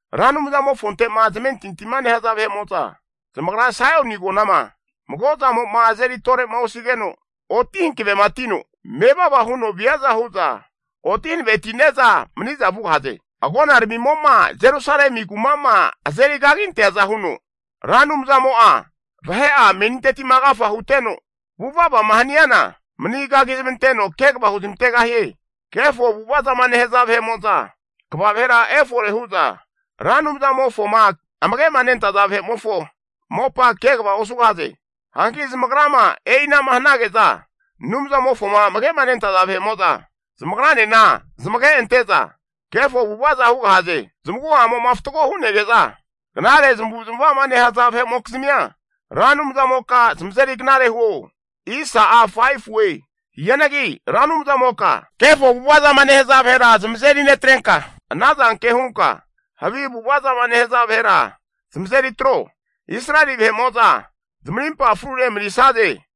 Ra Anumzamofonte'ma zamentintima nehaza vahe'mo'za zamagra Saioni Agonama mago zamo'ma azeri tore'ma osigeno, oti hankavematino mevava huno viaza hu'za oti hanavetine'za mani'za vugahaze. Agonaramimo'ma Jerusalemi kuma'ma azeri kaginteaza huno, Ra Anumzamo'a vahe'a meninteti'ma agafa huteno vuvavama haniana manigagi zamanteno kegava huzmantegahie. Kefo avu'ava zama nehaza vahe'mo'za kva vahera efore hu'za Ra Anumzamofoma amage'ma nentaza vahe'mofo mopa kegava osugahaze. Hanki zamagrama e'ina'ma hanage'za, Anumzamofoma amage'ma nentaza vahe'mo'za, zamagranena zamage ante'za kefo avu'avaza hugahaze. Zamagu'amo'ma fatgo hu'nege'za, knare zamavu zamava'ma nehaza vahe'mokizmia, Ra Anumzamoka zamazeri knare huo. Hianagi Ra Anumzamoka, kefo avu'ava zama nehaza vahera zamazeri netrenka, anazanke hunka havi avu'ava zama nehaza vahera zamazeri atro. Israeli vahe'mo'za zamarimpa frune manisaze.